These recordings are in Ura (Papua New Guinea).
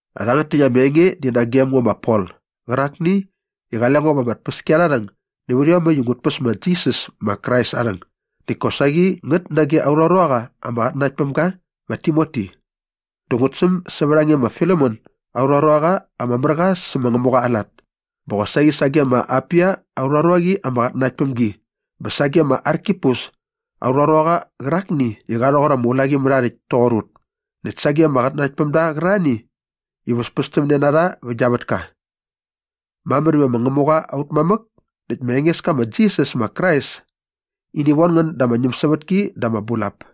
Rhangät täkt ama enge di nagem ngo ma Pol qärakni i qale ngo va ama tpäskiarharhäng nävät iomäkt i ngut päs ma Jisas ma Krais aa rhäng näkt kosaqi ngät nage aurha ruaqa ama qatnanakt päm ga ma Timoti. Dä ngut säm sävät a nge ma Filemon aurha ruaqa ama mär qa sä ma Ngämuqa aa lat bä qosaqi sage ma Apia aurha ruaqi ama qatnanakt päm gi bä sage ma Arkipus aurha ruaqa qärakni i qa rhoqor ama ulaqimärhaarhäkt toqor ut näkt sage ama qatnanaktpämda qärarhani i väspästämne na rha vä gia vätka. Mamär iva ma Ngämuqa aut mamäk näkt ma Engeska ma Jisas ma Krais ini von ngän da ama ñämsävätki dä ama bulap.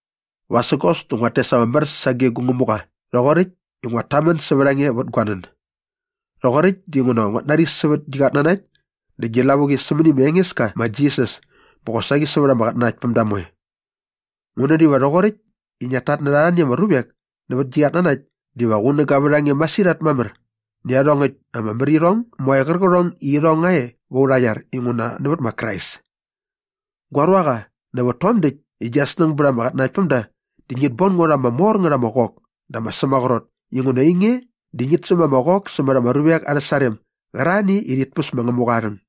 Vasägos dä nguat tes ama mär sage gu Ngämuqa rhoqoräkt i nguat tamän sävät a nge vät gua nän. Rhoqoräkt dinguna nguat nari sävät gi qatnanakt dä gi lavuqi sämäni ma Engeska ma Jisas bä qosaqi sävät ama qatnanaktpämda moe. Ngu nän iva rhoqoräkt i ngiat tatnärha arhani ama ruvek nävät gi qatnanakt diva qunäga vät a nge masirhat mamär nä iarhongäkt ama märirhong moe qärqärhong i irhong nga e va aurha iar inguna nävät ma Krais. Gua ruaqa, nävät tom däkt i gia snäng bät ama qatnanaktpämda dä ngit bon ngo rha ama mor ngät ama qok dä ama sämaqrot inguna ainge di ngit säm ama qok sämät ama ruvek arhä sarem gärarhani i rhit päs ma Ngämuqa aa rhäng.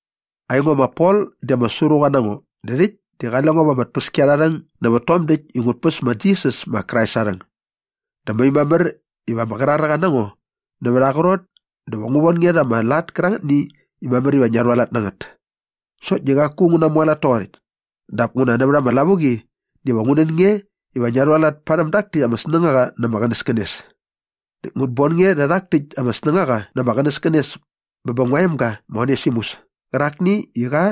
Aingo ma Pol di ama sruqa na ngo dä rhäkt di qale ngo va ama tpäskiarharhäng nävät tom däkt i ngut päs ma Jisas ma Krais aa rhäng. Dä mai mamär iva ama qraräqa na ngo nävät aa qrot dä ngu von nge rha ama lat kärangätni i mamär iva ngia rhualat na ngät. Sokt di qaku ngu namualat toqoräkt. Dap nguna nävät ama lavuqi diva ngu nän nge iva ngia rhualat parhäm dak täkt ama snängaqa na ama qänäskänes. Näkt ngut bon nge rhä rhak täkt ama snängaqa na ama qänäskänes bä bä ngua emga ma Onesimus kärakni i qa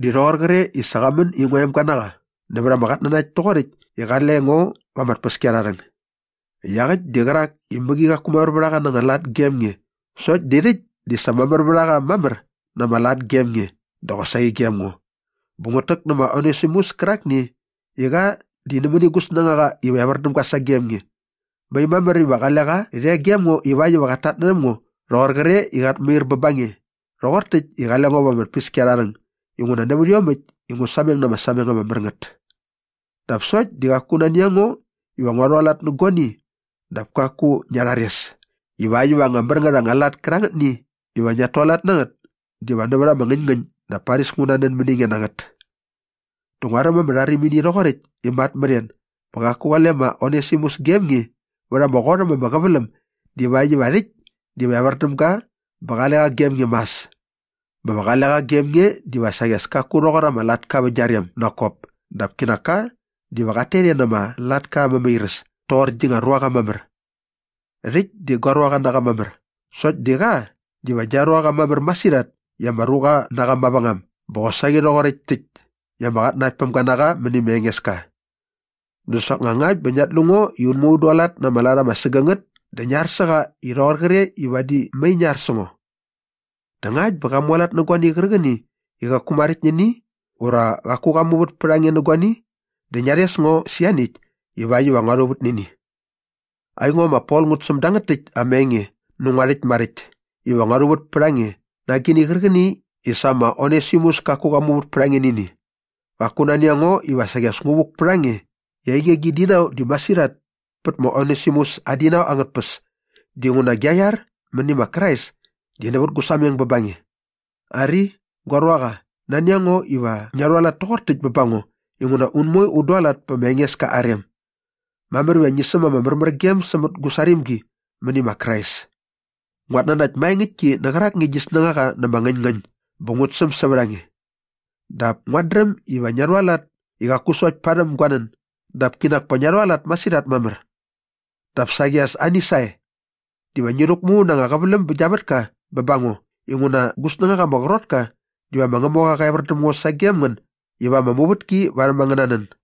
di rhoqor qre i sa qa män i ngua emga na qa nävät ama qatnanakt toqoräkt i qale ngo va ama tpäskiarharhäng. Iaqäkt di qärak i mäqi qaku mamär vät a qa na anga lat gem nge sokt di rhäkt di sa mamär vät a qa mamär na ama lat gem nge dä qosaqi gem ngo. Bä ngut täk nä ma Onesimus kärakni i qa di nämäni gu snängaqa iva evär däm ga sagem nge. Mai mamär iva qale qa rhe gem ngo ivakt iva qat tatnärhäm ngo rhoqor qre i qat mair bä ba nge rhoqor täkt i qale ngo va ama tpäskiarharhäng inguna nävät iomäkt i ngu sameng na ama sameng ama mär ngät. Dap sokt di qaku nani a ngo iva ngua rhualat nä guani dap kaku ngia rhares ivakt iva anga mär ngät anga lat kärangätni iva ngiat tualat na ngät diva nävät ama ngäñngäñ dap paris ngu nanän mäni nge na ngät. Dä nguaräm ama rharimini rhoqoräkt i mat mät en bä qaku qale ma Onesimus gem nge vät ama qot äm ama qäväläm divakt iva rhäkt diva evär däm ga bä qale qa gem nge mas bä va qale qa gem nge diva saqi as kaku rhoqor ama latka vä gia rem nak kop dap kinak ka diva qat tet e na ama latka aa mämairäs toqor gi nga ruaqa mamär. Rhäkt di gua ruaqa na qa mamär sokt di qa diva gia ruaqa mamär masirhat i ama ruqa na qa mavängam bä qosaqi rhoqoräkt täkt i ama qatnanaktpämga na qa mäni ma Engeska. Dä soknga ngakt bä ngiat lu ngo i un moe un dualat na ama lat ama sägängät dä ngi ar sä qa rhoqor qre i vadi mai ngi ar sä ngo. Dä ngakt bä qa mualat nä guani qärqäni i qaku maräkt nä ini ura qaku qa muvät pät a nge nä guani dä ngia rhes ngo sä ianiäkt ivakt iva ngua rhuvät nä ini. Aingo ma Pol ngut säm dangät täkt ama enge nä ngua rhäkt maräkt iva ngua rhuvät pät a nge na agini qärqäni i sa ma Onesimus kaku qa muvät pät a nge nä ini. Qaku nani a ngo iva saqi as ngu vuk pät a nge i ainge gi dinau di masirhat pät ma Onesimus aa dinau angät tpäs dinguna gia iar mäni ma Krais di nävät gu sameng bä ba nge. Ari, gua ruaqa, nani a ngo iva ngia rhualat toqor täkt bä ba ngo inguna un moe un dualat pä ma Engeska aa rem. Mamär iva ngi säm ama märmärgem sämät gu sarimgi mäni ma Krais. Nguat nanakt maengäktki nä qärakni gi snängaqa na ama ngäñngäñ bä ngut säm sävät a nge. Dap nguat dräm iva ngia rhualat i qaku sokt parhäm gua nän dap kinak pa ngia rhualat masirhat mamär. Dap saqi as ani sae. Diva ngi rhäkmu na anga qäväläm bä gia vätka bä ba ngo inguna gu snängaqa ama qrot ka diva ma Ngämuqa qa evär däm ngo sagem ngän iva ama muvätki varhäm angäna nän.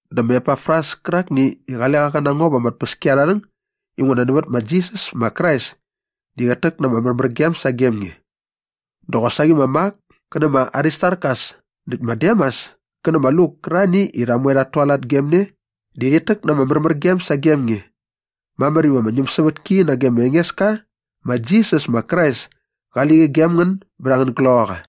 Dä ma Epafras kärakni i qale qa qä na ngo va ama tpäskiarharhäng inguna nävät ma Jisas ma Krais di qät täk na ama märmärgem sagem nge. Dä qosaqi ma Mak kä nä ma Aristarkas näkt ma Demas kä nä ma Luk kärarhani i ut moe ut tualat gem ne di rhit täk na ama märmärgem sagem nge. Mamär iva ama ñämsävätki nage ma Engeska ma Jisas ma Krais kali qi gem ngän bät angän gloqaqa.